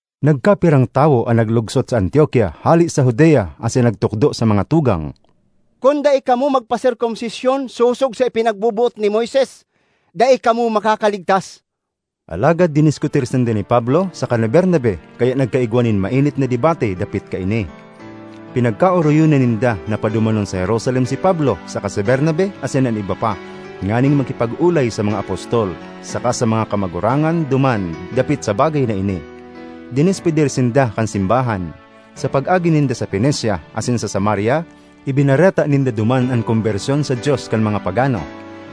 Nagkapirang tawo an naglugsot sa Antiokia hale sa Judea asin nagtukdo sa mga tugang, “Kun dai kamo magpaserkomsisyon sosog sa ipinagboboot ni Moises, dai kamo makakaligtas.” Alagad diniskutir sinda ni Pablo saka ni Bernabe kaya nagkaigwa nin mainit na debate dapit kaini. Pinagkaoroyonan ninda na padumanon sa Jerusalem si Pablo saka si Bernabe asin an iba pa, nganing makipag-olay sa mga apostol saka sa mga kamagurangan duman dapit sa bagay na ini. Dinespedir sinda kan simbahan; sa pag-agi ninda sa Fenecia asin sa Samaria, ibinareta ninda duman an kombersyon sa Dios kan mga pagano.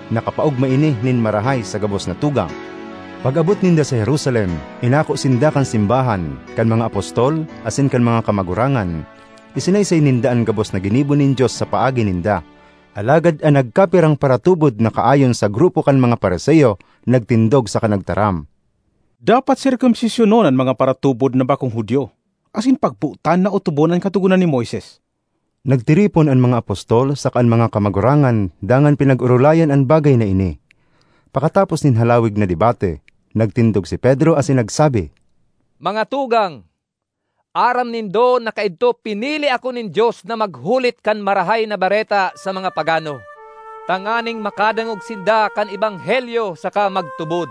Nakapaogma ini nin marahay sa gabos na tugang. Pag-abot ninda sa Jerusalem, inako sinda kan simbahan, kan mga apostol, asin kan mga kamagurangan. Isinaysay ninda an gabos na ginibo nin Dios sa paagi ninda. Alagad an nagkapirang paratubod na kaayon sa grupo kan mga Fariseo nagtindog saka nagtaram, “Dapat serkomsisyonon an mga paratubod na bakong Judio asin pagbotan na otobon an Katogonan ni Moises.” Nagtiripon an mga apostol saka an mga kamagurangan dangan pinag-orolayan an bagay na ini. Pakatapos nin halawig na debate, nagtindog si Pedro asin nagsabi, “Mga tugang, aram nindo na kaidto pinili ako nin Dios na maghulit kan Marahay na Bareta sa mga pagano, tanganing makadangog sinda kan ebanghelyo saka magtubod.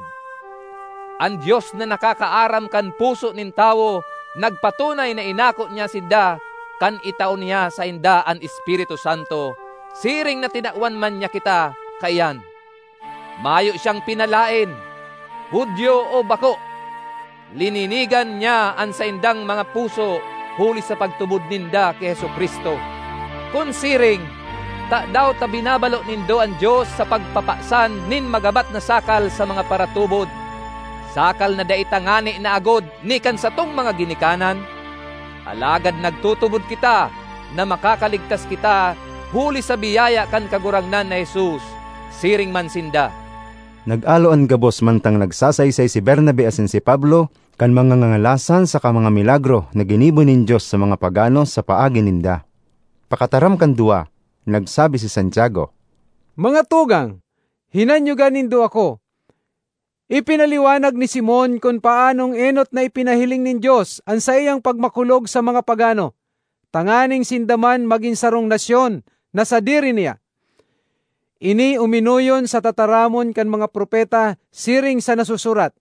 An Dios na nakakaaram kan puso nin tawo nagpatunay na inako niya sinda kan itao niya sainda an Espiritu Santo, siring na tinawan man niya kita kaiyan. Mayo siyang pinalaen, Judio o bako; lininigan niya an saindang mga puso huli sa pagtubod ninda ki Jesu-Cristo. Kun siring, tadaw ta binabalo nindo an Dios sa pagpapasan nin magabat na sakal sa mga paratubod, sakal na dai ta ngani naagod ni kan satong mga ginikanan? Alagad nagtutubod kita na makakaligtas kita huli sa biyaya kan Kagurangnan na Jesus; siring man sinda.” Nag-alo an gabos mantang nagsasaysay si Bernabe asin si Pablo kan mga ngangalasan saka mga milagro na ginibo nin Dios sa mga pagano sa paagi ninda. Pakataram kan duwa, nagsabi si Santiago, “Mga tugang, hinanyoga nindo ako! Ipinaliwanag ni Simon kun paanong enot na ipinahiling nin Dios an saiyang pagmakulog sa mga pagano tanganing sinda man magin sarong nasyon na sadiri niya. Ini uminoyon sa tataramon kan mga propeta siring sa nasusurat,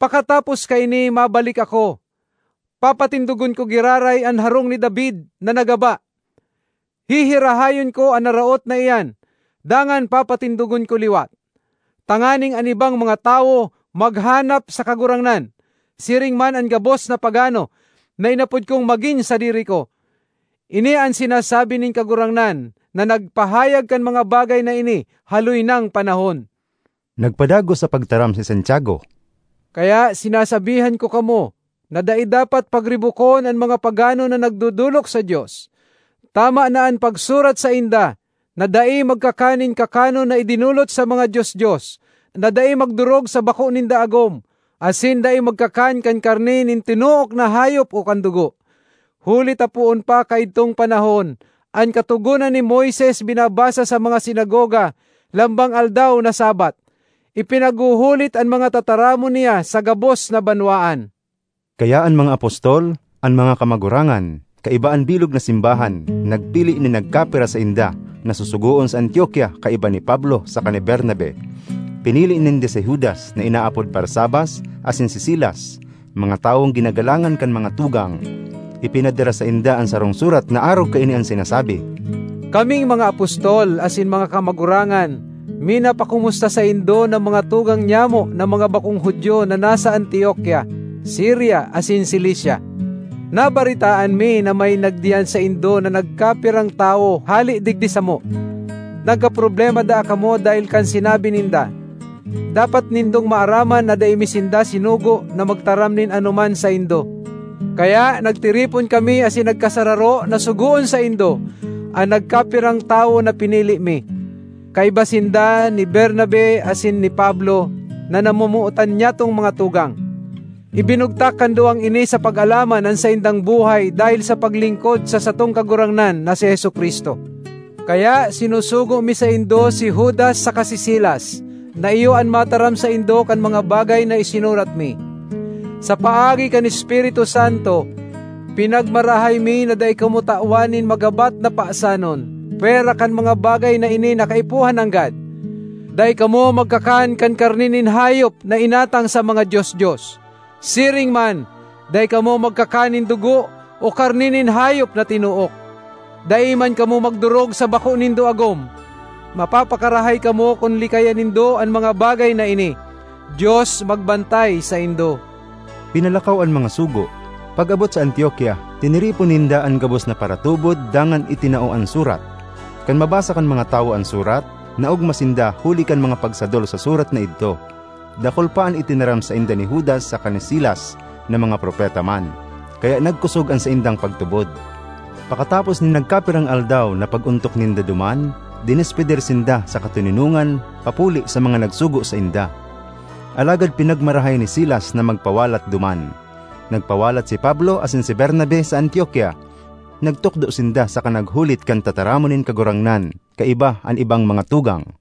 ‘Pakatapos kaini, mabalik ako; papatindogon ko giraray an harong ni David na nagaba; hihirahayon ko an naraot na iyan, dangan papatindogon ko liwat, tanganing an ibang mga tawo maghanap sa Kagurangnan, siring man an gabos na pagano na inapod kong magin sadiri ko. Ini an sinasabi nin Kagurangnan, na nagpahayag kan mga bagay na ini haloy nang panahon.’ Nagpadagos sa pagtaram si Santiago, “Kaya sinasabihan ko kamo na dai dapat pagribokon an mga pagano na nagdodolok sa Dios. Tama na an pagsurat sainda na dai magkakan nin kakanon na idinolot sa mga dios-dios, na dai magdorog sa bako ninda agom, asin dai magkakan kan karne nin tinook na hayop o kan dugo. Huli ta poon pa kaidtong panahon, an Katogonan ni Moises binabasa sa mga sinagoga lambang aldaw na Sabbath, ipinaghuhulit an mga tataramon niya sa gabos na banwaan.” Kaya an mga apostol, an mga kamagurangan, kaiba an bilog na simbahan, nagpili nin nagkapira sainda na susugoon sa Antiokia kaiba ni Pablo saka ni Bernabe. Pinili ninda si Judas na inaapod Barsabas asin si Silas, mga tawong ginagalangan kan mga tugang. Ipinadara sainda an sarong surat na arog kaini an sinasabi: “Kaming mga apostol asin mga kamagurangan minapakomusta saindo na mga tugang niamo na mga bakong Judio na nasa Antiokia, Siria asin Cilicia. Nabaretaan mi na may nagdiyan saindo na nagkapirang tawo hale digdi samo. Nagkaproblema daa kamo dahel kan sinabi ninda. Dapat nindong maaraman na dai mi sinda sinugo na magtaram nin anoman saindo. Kaya nagtiripon kami asin nagkasararo na sugoon saindo an nagkapirang tawo na pinili mi. Kaiba sinda ni Bernabe asin ni Pablo na namomotan niatong mga tugang. Ibinugtak kan duwang ini sa pag-alaman an saindang buhay dahel sa paglingkod sa satong Kagurangnan na si Jesu-Cristo. Kaya sinusugo mi saindo si Judas saka si Silas na iyo an mataram saindo kan mga bagay na isinurat mi. Sa paagi kan Espiritu Santo, pinagmarahay mi na dai kamo tawan nin magabat na pasanon pwera kan mga bagay na ini na kaipuhan nanggad: dai kamo magkakan kan karne nin hayop na inatang sa mga dios-dios; siring man, dai kamo magkakan nin dugo, o karne nin hayop na tinook; dai man kamo magdorog sa bako nindo agom. Mapapakarahay kamo kun likayan nindo an mga bagay na ini. Dios magbantay saindo.” Pinalakaw an mga sugo; pag-abot sa Antiokia, tiniripon ninda an gabos na paratubod dangan itinao an surat. Kan mabasa kan mga tawo an surat, naogma sinda huli kan mga pagsadol sa surat na idto. Dakul pa an itinaram sainda ni Judas saka ni Silas na mga propeta man, kaya nagkosog an saindang pagtubod. Pakatapos nin nagkapirang aldaw na pag-ontok ninda duman, dinespedir sinda sa katoninongan papuli sa mga nagsugo sainda. Alagad pinagmarahay ni Silas na magpawalat duman. Nagpawalat si Pablo asin si Bernabe sa Antiokia. Nagtukdo sinda saka naghulit kan tataramon nin Kagurangnan kaiba an ibang mga tugang.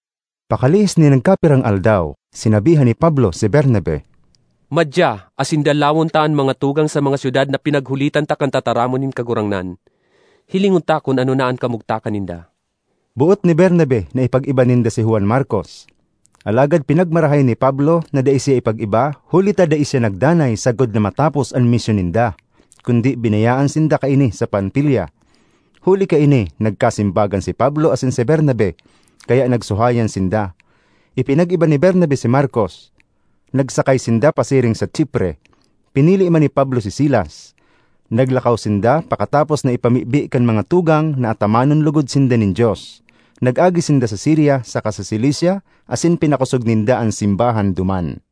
Pakalihis nin nagkapirang aldaw, sinabihan ni Pablo si Bernabe, “Madya asin dalawon ta an mga tugang sa mga syudad na pinaghulitan ta kan tataramon nin Kagurangnan; hilingon ta kun ano na an kamugtakan ninda.” Boot ni Bernabe na ipag-iba ninda si Juan Markos, alagad pinagmarahay ni Pablo na dai siya ipag-iba huli ta dai siya nagdanay sagkod na matapos an misyon ninda, kundi binayaan sinda kaini sa Panfilia. Huli kaini nagkasimbagan si Pablo asin si Bernabe; kaya nagsuhayan sinda. Ipinag-iba ni Bernabe si Markos; nagsakay sinda pasiring sa Chipre. Pinili man ni Pablo si Silas. Naglakaw sinda pakatapos na ipamibi kan mga tugang na atamanon logod sinda nin Dios. Nag-agi sinda sa Siria saka sa Cilicia asin pinakosog ninda an simbahan duman.